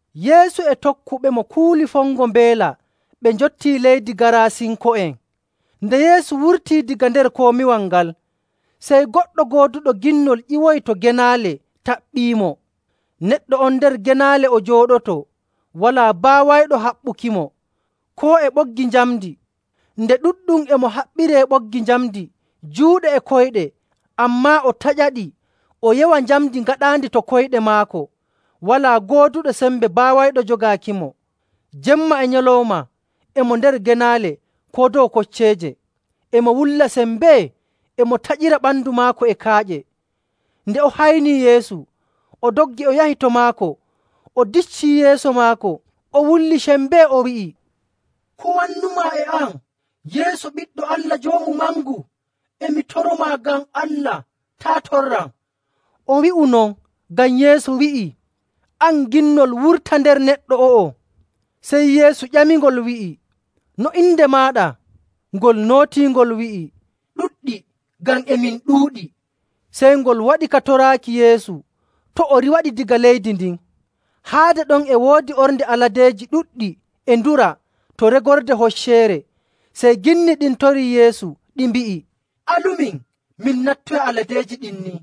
Yeesu e tokkuɓemo kuuli fongo mbeela ɓe njottii leydi Gaarasinko'en. Nde Yeesu wurtii daga nder komiwal ngal, sey goɗɗo gooduɗo ginnol ƴiwoyi to genaale taɓɓiimo. Neɗɗo on nder genaale o jooɗotoo, walaa baawayɗo haɓɓukimo, koo e ɓoggi njamndi. Nde ɗuɗɗum e mo haɓɓiree ɓoggi njamndi juuɗe e koyɗe, ammaa o taƴaɗi o yewa njamndi gaɗaandi to koyɗe maako. Walaa gooduɗo sembe baawayɗo jogaakimo. Jemma e nyalawma e mo nder genaale koo dow kocceeje, e mo wulla sembee, e mo taƴira ɓandu maako e kaaƴe. Nde o haynii Yeesu, o doggi o yahi to maako, o diccii yeeso maako. O wulli sembee o wi'i, “Ko wannumaa e am, Yeesu Ɓiɗɗo Allah Joomu Mangu? E mi toromaa ngam Allah, taa' torram.” O wi'u non ngam Yeesu wi'ii, “An ginnol, wurta nder neɗɗo o'o!” Sey Yeesu ƴamingol wi'i, “No inde maaɗa?” Ngol nootii ngol wi'i, “Ɗuɗɗi, ngam e min ɗuuɗi.” Sey ngol waɗi ka toraaki Yeesu to' o riiwaɗi daga leydi ndin. Haade ɗon e woodi ornde aladeeji ɗuɗɗi e dura to regorde hocceere. Sey ginni ɗin torii Yeesu ɗi mbi'i, “Alumin min nattoya aladeeji ɗin ni.”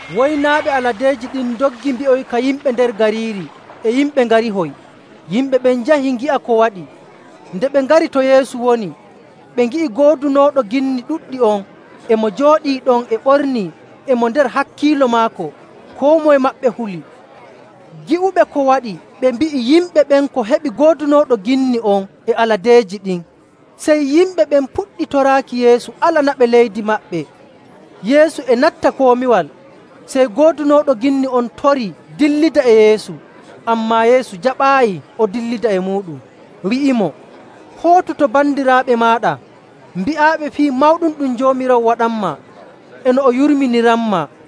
Woynaaɓe aladeeji ɗin ndoggi mbi'oyika yimɓe nder gariiri e yimɓe ngarihoy. Yimɓe ɓen njahi ngi'a ko waɗi. Nde ɓe ngari to Yeesu woni, ɓe ngi'i goodunooɗo ginni ɗuɗɗi on, e mo jooɗii ɗon, e ɓornii, e mo nder hakkiilo maako. Koo moye maɓɓe huli. Gi'uɓe ko waɗi ɓe mbi'i yimɓe ɓen ko heɓi goodunooɗo ginni on e aladeeji ɗin. Sey yimɓe ɓen puɗɗi toraaki Yeesu alanaɓe leydi maɓɓe. Yeesu e natta komiwal, sey goodunooɗo ginni on torii dillida e Yeesu. Ammaa Yeesu jaɓaayi o dillida e muuɗum, wi'imo, “Hootu to bandiraaɓe maaɗa mbi'aɓe fii mawɗum ɗum Joomiraawo waɗanmaa e no o yurminiranmaa.”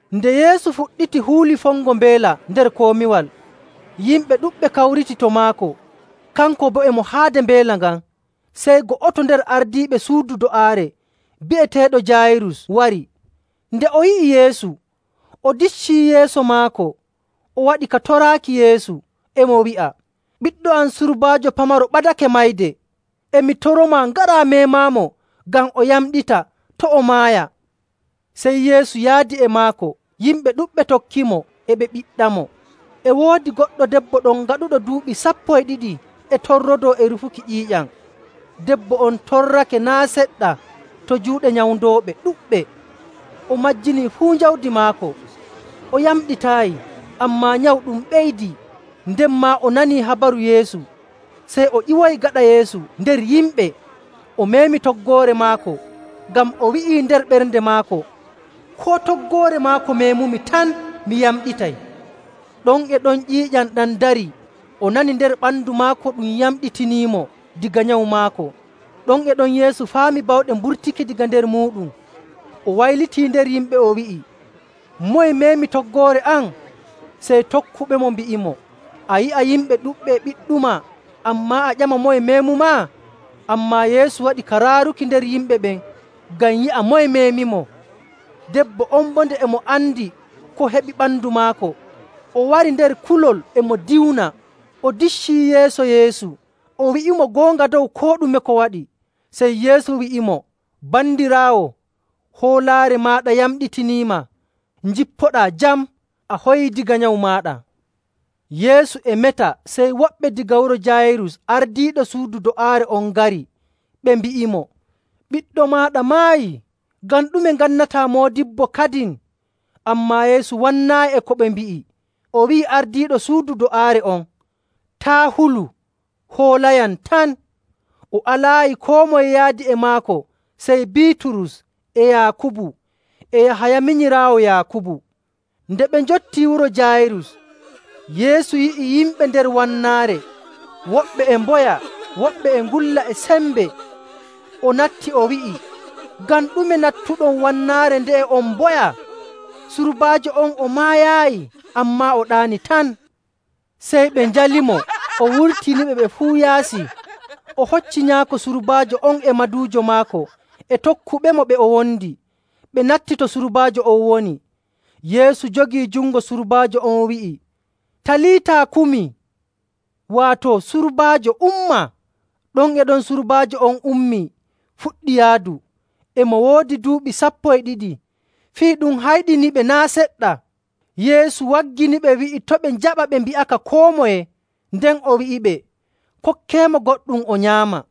Nde Yeesu fuɗɗiti huuli fongo mbeela nder komiwal, yimɓe ɗuɗɓe kawriti to maako, kanko boo e mo haade mbeela ngan. Sey go'oto nder ardiiɓe suudu do'aare bi'eteeɗo Jaayirus wari. Nde o yi'i Yeesu, o diccii yeeso maako, o waɗi ka toraaki Yeesu, e mo wi'a, “Ɓiɗɗo am surbaajo pamaro ɓadake mayde, e mi toromaa ngaraa meemaamo ngam o yamɗita to' o maaya.” Sey Yeesu yaadi e maako. Yimɓe ɗuɗɓe tokkimo, e ɓe ɓiɗɗamo. E woodi goɗɗo debbo ɗon gaɗuɗo duuɓi sappo e ɗiɗi e torrodoo e rufuki ƴiiƴam. Debbo on torrake naa' seɗɗa to juuɗe nyawndooɓe ɗuɗɓe, o majjinii fuu jawdi maako. O yamɗitaayi, ammaa nyawu ɗum ɓeydii. Nden maa o nanii habaru Yeesu, sey o ƴiwoyi gaɗa Yeesu nder yimɓe, o meemi toggoore maako. Ngam o wi'ii nder ɓernde maako, “Koo toggoore maako meemumi tan, mi yamɗitay.” Ɗon e ɗon ƴiiƴam ɗam darii, o nani nder ɓandu maako ɗum yamɗitiniimo daga nyawu maako. Ɗon e ɗon Yeesu faami bawɗe mburtake daga nder muuɗum. O waylitii nder yimɓe, o wi'i, “Moye meemi toggoore am?” Sey tokkuɓemo mbi'imo, “A yi'a yimɓe ɗuɗɓe e ɓiɗɗumaa, ammaa a ƴama moye meemumaa?” Ammaa Yeesu waɗi ka raaruki nder yimɓe ɓen ngam yi'a moye meemimo. Debbo on boo nde e mo andi ko heɓi ɓandu maako, o wari nder kulol e mo diwna, o diccii yeeso Yeesu, o wi'imo goonga dow koo ɗume ko waɗi. Sey Yeesu wi'imo, “Bandiraawo, hoolaare maaɗa yamɗitiniima. Njippoɗaa jam, a hoyii daga nyawu maaɗa.” Yeesu e meta, sey woɓɓe daga wuro Jaayirus ardiiɗo suudu do'aare on ngari, ɓe mbi'imo, “Ɓiɗɗo maaɗa maayii. Ngam ɗume ngannataa moodibbo kadin?” Ammaa Yeesu wannaayi e ko ɓe mbi'i, o wi'i ardiiɗo suudu do'aare on, “Taa' hulu, hoolayam tan.” O alaayi koo moye yaadi e maako sey Biiturus, e Yaakubu, e Yahaya minyiraawo Yaakubu. Nde ɓe njottii wuro Jaayirus, Yeesu yi'i yimɓe nder wannaare, woɓɓe e mboya, woɓɓe e ngulla e sembe. O natti, o wi'i, “Ngam ɗume nattuɗon wannaare nde'e on mboya? Surbaajo on o maayaayi, ammaa o ɗaani tan.” Sey ɓe njalimo. O wurtiniɓe ɓe fuu yaasi, o hocci nyaako surbaajo on e maduujo maako e tokkuɓemo ɓe o wondi, ɓe natti to surbaajo on woni. Yeesu jogii jungo surbaajo on wi'i, “Taliita, kumi,” waato, “Surbaajo, umma!” Ɗon e ɗon surbaajo on ummii fuɗɗi yaadu. E mo woodi duuɓi sappo e ɗiɗi. Fii ɗum hayɗiniɓe naa' seɗɗa. Yeesu wagginiɓe wi'i to' ɓe njaɓa ɓe mbi'aka koo moye. Nden o wi'iɓe, “Kokkeemo goɗɗum o nyaama.”